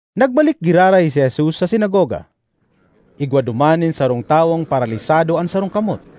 Nagbalik giraray si Jesus sa sinagoga. Igwa duman nin sarong tawong paralisado an sarong kamot.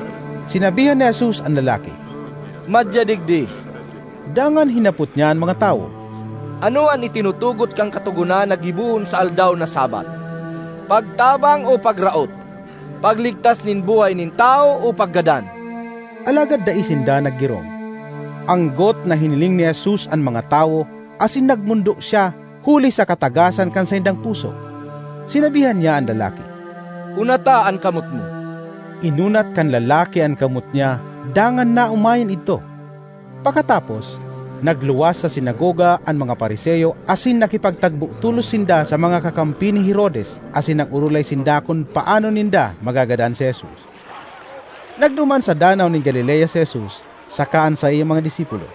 Sinabihan ni Jesus an lalaki, “Madya digdi.” Dangan hinapot niya an mga tawo, “Ano an itinutugot kan Katogonan na gibohon sa aldaw na Sabbath? Pagtabang o pagraot? Pagligtas nin buhay nin tawo o paggadan?” Alagad dai sinda naggirong. Anggot na hiniling ni Jesus an mga tawo asin nagmondo siya huli sa katagasan kan saindang puso. Sinabihan niya an lalaki, “Unata an kamot mo.” Inunat kan lalaki an kamot niya dangan naomayan idto. Pakatapos, nagluwas sa sinagoga an mga Fariseo asin nakipagtagbo tolos sinda sa mga kakampi ni Herodes asin nag-orolay sinda kun paano ninda magagadan si Jesus. Nagduman sa Danaw nin Galilea si Jesus saka an saiyang mga disipulo;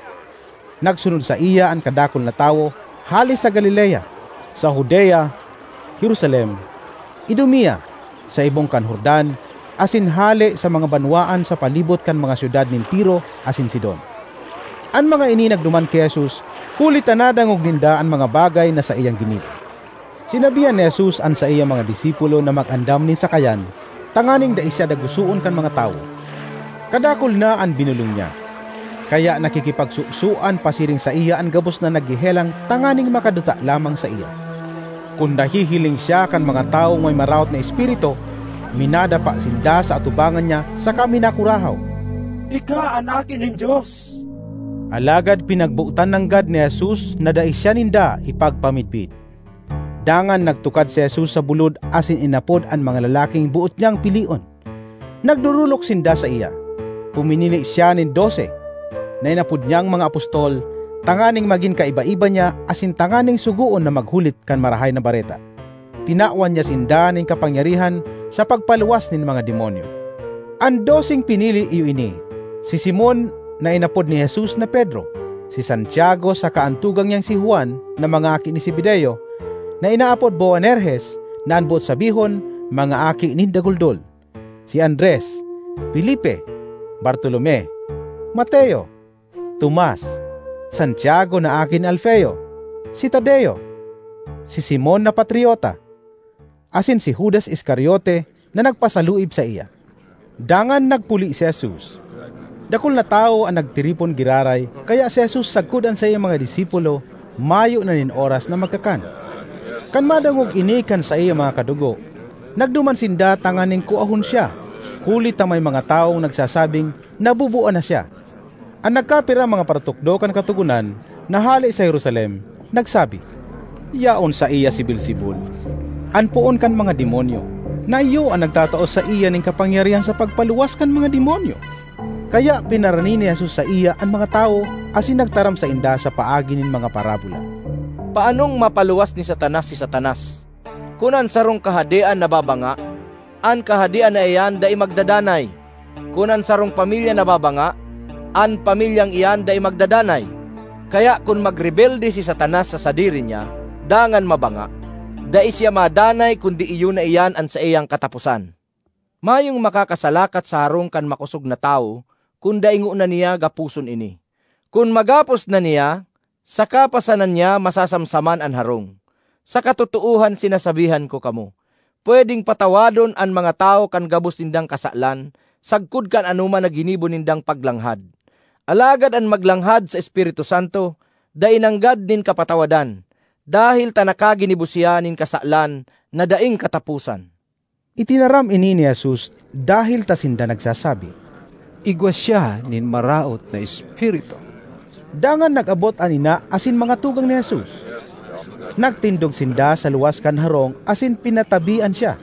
nagsunod saiya an kadakul na tawo hale sa Galilea, sa Judea, Jerusalem, Idumea, sa ibong kan Jordan asin hale sa mga banwaan sa palibot kan mga syudad nin Tiro asin Sidon. An mga ini nagduman ki Jesus huli ta nadangog ninda an mga bagay na saiyang ginibo. Sinabihan ni Jesus an saiyang mga disipulo na mag-andam nin sakayan tanganing dai siya dagosoon kan mga tawo. Kadakul na an binolong niya, kaya nakikipagsosoan pasiring saiya an gabos na naghehelang tanganing makaduta lamang saiya. Kun nahihiling siya kan mga tawong may maraot na espiritu, minadapa sinda sa atubangan niya saka minakurahaw, “Ika an Aki nin Dios!” Alagad pinagbotan nanggad ni Jesus na dai siya ninda ipagpamidbid. Dangan nagtukad si Jesus sa bulod asin inapod an mga lalaking boot niyang pilion; nagdorolok sinda saiya. Puminili siya nin dose (na inapod niyang mga apostol) tanganing magin kaiba-iba niya asin tanganing sugoon na maghulit kan Marahay na Bareta. Tinawan niya sinda nin kapangyarihan sa pagpaluwas nin mga demonyo. An doseng pinili iyo ini: si Simon (na inapod ni Jesus na Pedro); si Santiago saka an tugang niyang si Juan na mga aki ni Zebedeo (na inaapod Boanerges, na an boot sabihon “Mga Aki nin Daguldol”); si Andres, Felipe, Bartolome, Mateo, Tomas, Santiago na aki ni Alfeo, si Tadeo, si Simon na Patriota, asin si Judas Iscariote na nagpasaluib saiya. Dangan nagpuli si Jesus. Dakul na tawo an nagtiripon giraray kaya si Jesus sagkod an saiyang mga disipulo mayo na nin oras na magkakan. Kan madangog ini kan saiyang mga kadugo, nagduman sinda tanganing kuahon siya huli ta may mga tawong nagsasabing nabubua na siya. An nagkapirang mga paratukdo kan Katogonan na hale sa Jerusalem nagsabi, “Yaon saiya si Beelzebul, an poon kan mga demonyo, na iyo an nagtatao saiya nin kapangyarihan sa pagpaluwas kan mga demonyo.” Kaya pinarani ni Jesus saiya an mga tawo asin nagtaram sainda sa paagi nin mga parabola, “Paanong mapaluwas ni Satanas si Satanas? Kun an sarong kahadean nababanga, an kahadean na iyan dai magdadanay. Kun an sarong pamilya nababanga, an pamilyang iyan dai magdadanay. Kaya kun magrebelde si Satanas sa sadiri niya dangan mabanga, dai siya madanay kundi iyo na iyan an saiyang kataposan. ”Mayong makakasalakat sa harong kan makosog na tawo kun dai ngona niya gaposon ini. Kun magapos na niya, saka pa sana niya masasamsaman an harong. ”Sa Katotoohan sinasabihan ko kamo, pwedeng patawadon an mga tawo kan gabos nindang kasalan sagkod kan anoman na ginibo nindang paglanghad. Alagad an maglanghad sa Espiritu Santo dai nanggad nin kapatawadan dahel ta nakaginibo siya nin kasalan na daing kataposan.” (Itinaram ini ni Jesus dahel ta sinda nagsasabi, “Igwa siya nin maraot na espiritu.”) Dangan nag-abot an ina asin mga tugang ni Jesus. Nagtindog sinda sa luwas kan harong asin pinatabian siya.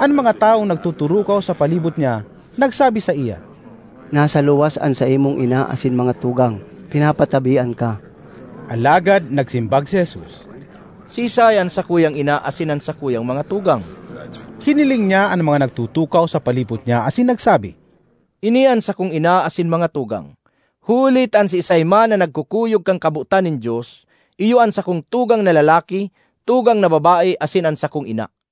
An mga tawong nagtuturukaw sa palibot niya nagsabi saiya, “Nasa luwas an saimong ina asin mga tugang, pinapatabian ka.” Alagad nagsimbag si Jesus, “Siisay an sakuyang ina asin an sakuyang mga tugang?” Hiniling niya an mga nagtutukaw sa palibot niya asin nagsabi, “Ini an sakong ina asin mga tugang! Huli ta an siisay man na nagkukuyog kan kabotan nin Dios iyo an sakong tugang na lalaki, tugang na babae asin an sakong ina.”